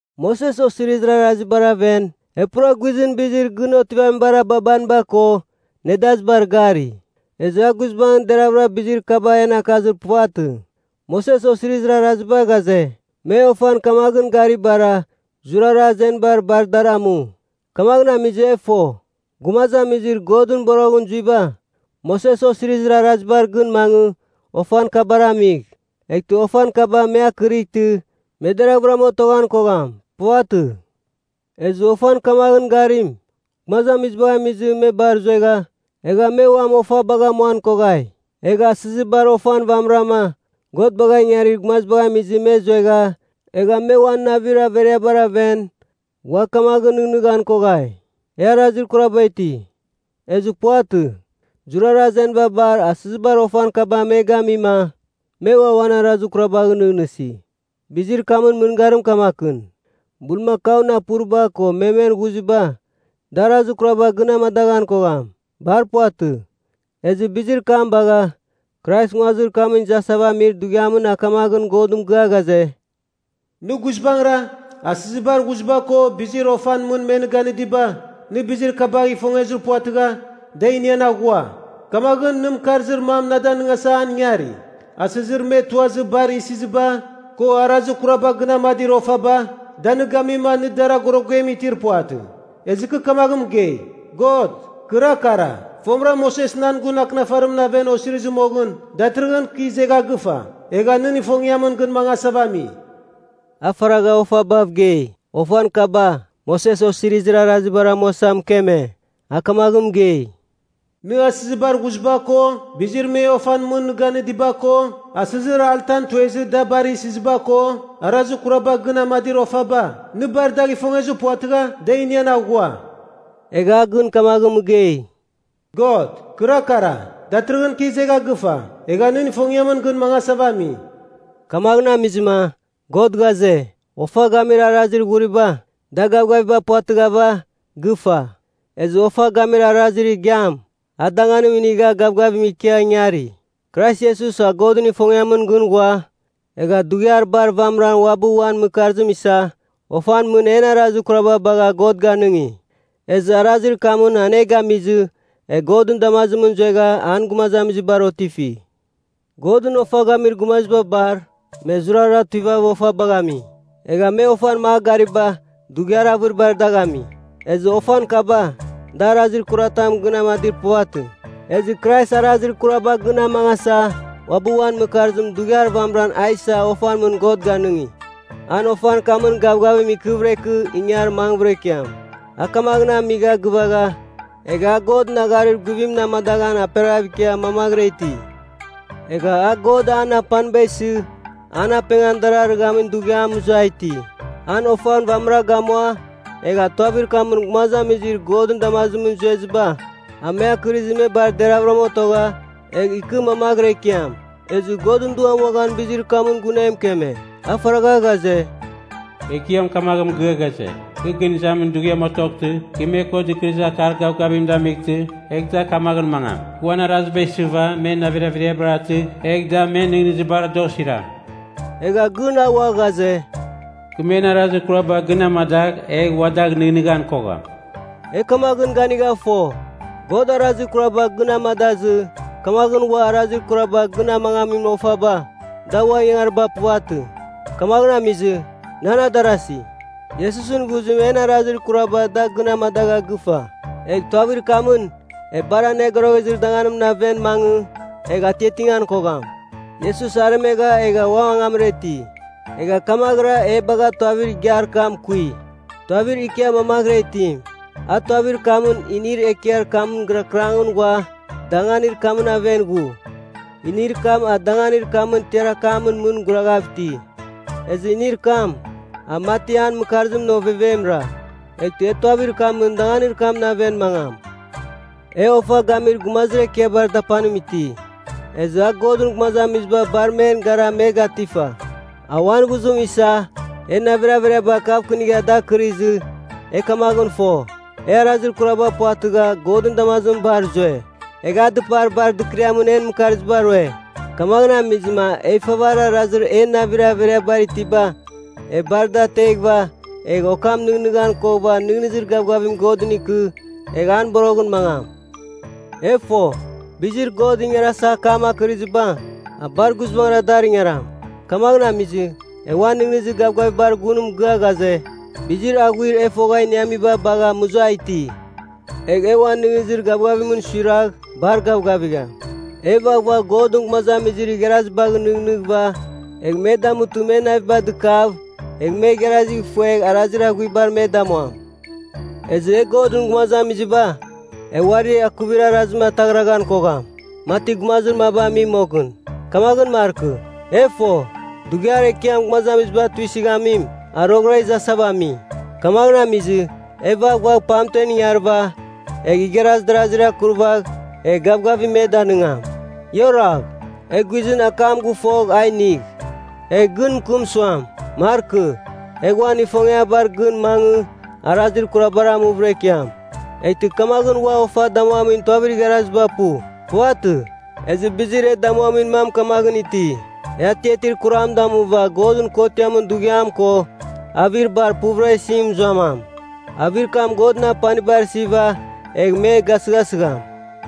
Moses Osirizir Arazibar aven, e pura guizɨn bizir gɨn otivamibar ababaniba ko nedazibar gari. Ezɨ a guizbangɨn deravɨra bizir kabar en akazir puvatɨ. Moses Osirizir Araziba ghaze, me ofan kamaghɨn garibara, zurara azeniba bar dar amu. Kamaghɨn amizɨ e fo, gumazamizir Godɨn boroghɨn zuiba, Moses Osirizir Arazibar gɨn mangɨ ofan kabar amigh, eghtɨ ofan kaba me akɨrightɨ me deraghvɨram otoghan kogham. Puvatɨ. Ezɨ ofan kamaghɨn garim gumazamizibagh amizɨ me bar zuegha, egha me uam ofabagh amuan koghai. Egha asɨzibar ofan vamɨrama, God bagha ingarir gumazibagh amizɨ me zuegha, egha me uan navir averiabar aven ua kamaghɨn nɨghnɨghan koghai, e arazir kuraba iti. Ezɨ puvatɨ. Zurara azeniba bar asɨzibar ofan kaba me gamima me ua uan arazir kurabagh nɨghnɨsi. Bizir kamɨn mɨngarim kamakɨn: bulmakaun apuriba ko memen ghuziba, da arazir kuraba gɨn amadaghan kogham. Bar puvatɨ. Ezɨ bizir kam bagha, Krais nguazir kamɨn izasava amir dughiamɨn a kamaghɨn Godɨn mɨgɨa ghaze, “Nɨ guizbangɨra, asɨzibar ghuziba ko bizir ofan mɨn me nɨ ganɨdiba, nɨ bizir kabagh ifongezir puvatɨgha da inian aghua. Kamaghɨn nɨ mɨkarzir mam na danɨngasa an ingari. Asɨzir me tuazɨ bar isiziba, ko arazir kuraba gɨn amadir ofaba, da nɨ gamima nɨ dar agorogem itir puvatɨ. Ezɨ kɨ kamaghɨn mɨgei, ‘God, kɨra kara. Fomɨra Moses nan gun Akɨnafarimɨn aven osirizir moghɨn. Datɨrɨghɨn kɨ izegha gɨfa, egha nɨn ifongiamɨn gɨn mangasava ami.’” A faragha ofabav gei, ofan kaba, Moses Osirizir Arazibar amuasa mɨkeme. A kamaghɨn mɨgei, “Nɨ asɨzibar ghuziba ko, bizir me ofan mɨn nɨ ganɨdiba ko, asɨzir altan tuezɨ da bar isiziba ko, arazir kuraba gɨn amadir ofaba, nɨ bar dagh ifongezir puvatɨgha da inian aghua.” Egha a gɨn kamaghɨn mɨgei, “God, kɨra kara. Datɨrɨghɨn kɨ izegha gɨfa, egha nɨn ifongiamɨn gɨn mangasava ami.” Kamaghɨn amizɨma God ghaze, ofa gamir arazir ghuriba, da gavgaviba puvatɨghava, gɨfa. Ezɨ ofa gamir arazir igiam, an danganim inigha gavgavim ikia ingari. Krais Iesus a Godɨn ifongiamɨn gɨn ghua, egha dughiar bar vamɨra uabɨ uan mɨkarzim isa ofan mɨn en arazir kuraba bagha God ganɨngi. Ezɨ arazir kamɨn an e gamizɨ, e Godɨn damazimɨn zuegha an gumazamizibar otifi. Godɨn ofa gamir gumaziba bar, me zurara tuivava ofabagh ami. Egha me ofan magh gariba, dughiar avɨribar dagh ami. Ezɨ ofan kaba, da arazir kuratam gɨn amadir puvatɨ. Ezɨ Krais arazir kuraba gɨn amangasa uabɨ uan mɨkarzim dughiar vamɨran a isa ofan mɨn God ganɨngi. An ofan kamɨn gavgavim ikɨvɨra ikɨ ingar mangvɨra ikiam. A kamaghɨn amigha gɨvagha, egha a Godɨn agharir guvimɨn amadaghan aperaghav ikia mamaghɨra iti. Egha a, God an apaniba isɨ an apengan darɨghamin dughiam, mɨzua iti. An ofan vamɨra gamua egha tuavir kamɨn gumazamizir Godɨn damazimɨn zueziba, a me akɨrizɨ me bar deravɨram otogha, egh ikɨ mamaghɨra ikiam. Ezɨ Godɨn Duam uaghan bizir kam gun e mɨkeme. A faragha ghaze, “Ekiam kamaghɨn mɨgɨa ghaze, ‘Gɨn izamin dughiam otoghtɨ, kɨ me ko Akar Dɨkɨrɨzir Gavgavim damightɨ, eghtɨ a kamaghɨn mangam. Kɨ uan araziba isɨva men navir averiabar atɨgh, egh da men nɨghnɨzibar da osiram.’ Egha gɨn a ua ghaze, ‘Kɨ men arazir kuraba gɨn amadagh egh ua dagh nɨghnɨghan kogham.’” E kamaghɨn ganigha fo, God arazir kuraba gɨn amadazɨ, kamaghɨn ua arazir kuraba gɨn amangamin ofaba, da ua ingangariba puvatɨ. Kamaghɨn amizɨ, nan adarasi, Iesusɨn ghuzim en arazir kuraba da gɨn amadagha gɨfa. Egh tuavir kamɨn e Bar Anogoroghezir Danganimɨn aven mangɨ egh atiatingan kogham. Iesus aremegha egha ua angamra iti, egha kamaghɨra e bagha tuavir igiar kam kui, tuavir ikia mamaghɨra itim. A tuavir kamɨn inir ekiar kamɨn gɨrakɨrangɨn ghua danganir kamɨn aven ghu, inir kam a danganir kamɨn tiar akamɨn mɨn guraghav iti. Ezɨ inir kam, a mati an mɨkarzimɨn ovevemra. Eghtɨ e tuavir kamɨn danganir kamɨn aven mangam. E Ofa Gamir Gumazir Ekiabar Dapanim iti, ezɨ a Godɨn gumazamiziba bar men gara me gatifa. A uan ghuzim isa en navir averiaba kavkɨnigha dar akɨrizɨ, e kamaghɨn fo, e arazir kuraba puvatɨgha Godɨn damazimɨn bar zue. Egha a dɨpar bar dɨkɨriamɨn en mɨkarziba rue. Kamaghɨn amizɨma e ifavarir arazir en navir averiabar itiba e bar da ateghɨva, egh okam nɨghnɨghan koghɨva nɨghnɨzir gavgavim Godɨn ikɨ, egh an boroghɨn mangam. E fo, bizir God ingarasa akam akɨrɨziba, a bar guizbangɨra dar ingaram. Kamaghɨn amizɨ, e uan nɨghnɨzir gavgavibar gun mɨgɨa ghaze, bizir aghuir e fogha iniamiba bagha muza iti. Egh e uan nɨghnɨzir gavgavimɨn suiragh bar gavgavigham. E vaghvagh Godɨn gumazamizir igharazibagh nɨghnɨghɨva egh me damutɨ men naviba dɨkav, egh me igharazigh ifuegh arazir aghuibar me damuam. Ezɨ e Godɨn gumazamiziba, e uari akuvir arazim ataghraghan kogham, mati gumazir maba ami moghɨn. Kamaghɨn markɨ. E fo, Dughiar Ekiam Gumazamiziba Tuisɨghamim, a roghɨra izasava ami. Kamaghɨn ami, e vaghvagh pamtem ingarɨva, egh igharaz darazir akuravagh egh gavgavim me danɨngam. Ia oragh. E guizɨn akam gɨfogh a inigh, egh gɨn mɨkɨm suam, markɨ, egh uan ifongiabar gɨn mangɨ arazir kurabar amuvɨra ikiam, eghtɨ kamaghɨn ua ofa damuamin tuavir igharaziba pu. Puvatɨ. Ezɨ bizir e damuamir mam kamaghɨn iti: E atiatir kuram damuva Godɨn Kotiamɨn Dughiam ko, avir bar puvɨra isim mɨzuamam. Avir kam Godɨn apanibar isiva egh me gasɨghasɨgham.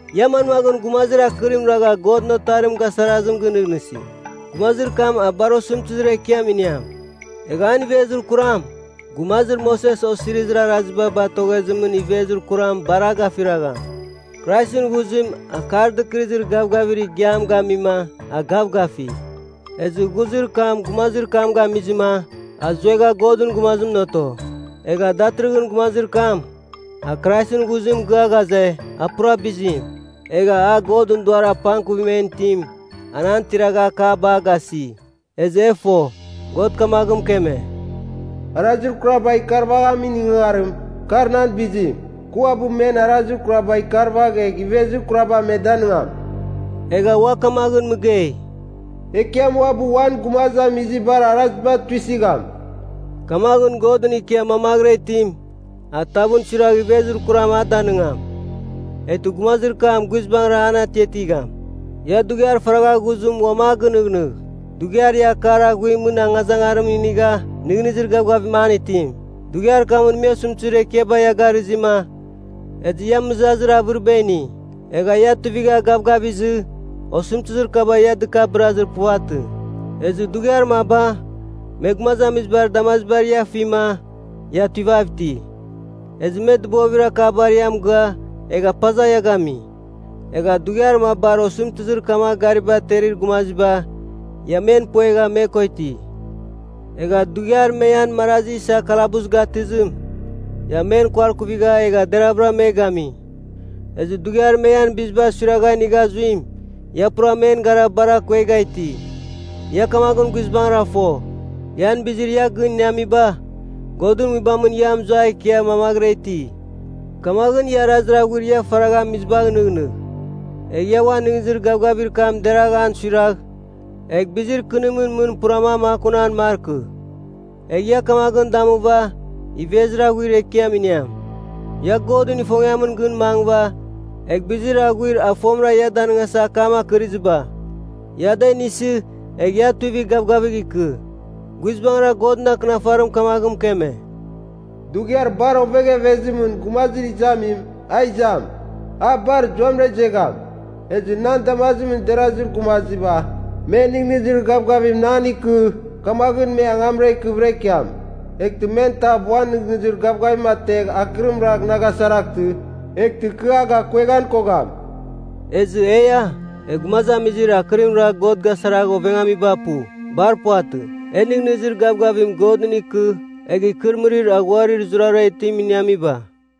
Ia manmaghɨn gumazir akɨrim ragha Godɨn Otarim gasarazim gɨnɨghnɨsi? Gumazir kam a bar osɨmtɨzir ekiam iniam. Egh an ivezir kuram, gumazir Moses Osirizir Araziba batoghezimɨn ivezir kuram, bar a gafiragham. Kraisɨn ghuzim Akar Dɨkɨrɨzir Gavgavir Igiam gamima a gavgafi. Ezɨ ghuzir kam gumazir kam gamizɨma a zuegha Godɨn gumazimɨn oto. Egha datɨrɨghɨn gumazir kam a Kraisɨn ghuzim mɨgɨa ghaze, a pura bizim. Egha a, Godɨn Duar apangkuvim en itim, an tiragha akaba a gasi. Ezɨ e fo, God kamaghɨn mɨkeme, “Arazir kuraba ikarvaghamin ingangarim, ka nan bizim. Kɨ uabɨ men arazir kuraba ikarvagh egh ivezir kuraba me danɨngam.” Egha ua kamaghɨn mɨgei, “Ekiam uabɨ uan gumazamizibar araziba tuisɨgham.” Kamaghɨn, Godɨn ikia mamaghɨra itim, a tavɨn suiragh ivezir kuram a danɨngam, eghtɨ gumazir kam guizbangɨra an atiatigham. Ia dughiar faragha ghuzim uam a gɨnɨghnɨgh, dughiar ia Akar Aghuimɨn angazangarim inigha nɨghnɨzir gavgavimɨn an itim. Dughiar kamɨn me osɨmtɨzir ekiaba ia garɨzima, ezɨ ia mɨzazir avɨriba ini. Egha ia tuivigha gavgavizɨ osɨmtɨzir kaba ia dɨkabɨrazir puvatɨ. Ezɨ dughiar maba me gumazamizibar damazibar ia afima ia tuivav iti, ezɨ me dɨbovir akabar ia mɨgɨa egha paza ia gami. Egha dughiar mabar osɨmtɨzir kamagh gariba aterir gumaziba, ia men puegha me ko iti. Egha dughiar me ian marazi isa kalabus gatɨzim, ia men kuarkuvigha egha deravɨra me gami. Ezɨ dughiar me ian biziba suiragha inigha ghuzim, ia pura men gara bar akuegha iti. Ia kamaghɨn guizbangɨra fo, ian bizir ia gɨn iniamiba Godɨn Nguibamɨn ia mɨzua ikia mamaghɨra iti. Kamaghɨn, ia arazir aghuir ia faragha amizibagh nɨghnɨgh, egh ia uan nɨghnɨzir gavgavir kam deragh an suiragh egh bizir kɨnimɨn mɨn pura a makunan markɨ. Egh ia kamaghɨn damuva ivezir aghuir ekiam iniam. Ia Godɨn ifongiamɨn gɨn mangɨva, egh bizir aghuir a fomɨra ia danɨngasa akam akɨrɨziba, ia da inisɨ, egh ia tuivigh gavgafigh ikɨ. Guizbangɨra, Godɨn Akɨnafarim kamaghɨn mɨkeme, “Dughiar bar oveghevezimɨn gumazir izamim, a izam. A bar zuamɨra izegham. Ezɨ nan damazimɨn derazir gumaziba, me nɨghnɨzir gavgavim nan ikɨ, kamaghɨn me angamra ikɨvɨra ikiam. Eghtɨ men tav uan nɨghnɨzir gavgavim ategh akɨrim ragh na gasaraghtɨ, eghtɨ kɨ a gakueghan kogham.” Ezɨ eia, e gumazamizir akɨrim ragh God gasaragh ovengamiba pu. Bar puvatɨ. E nɨghnɨzir gavgavim Godɨn ikɨ egh ikɨrɨmɨrir aghuarir zurara itim iniamiba.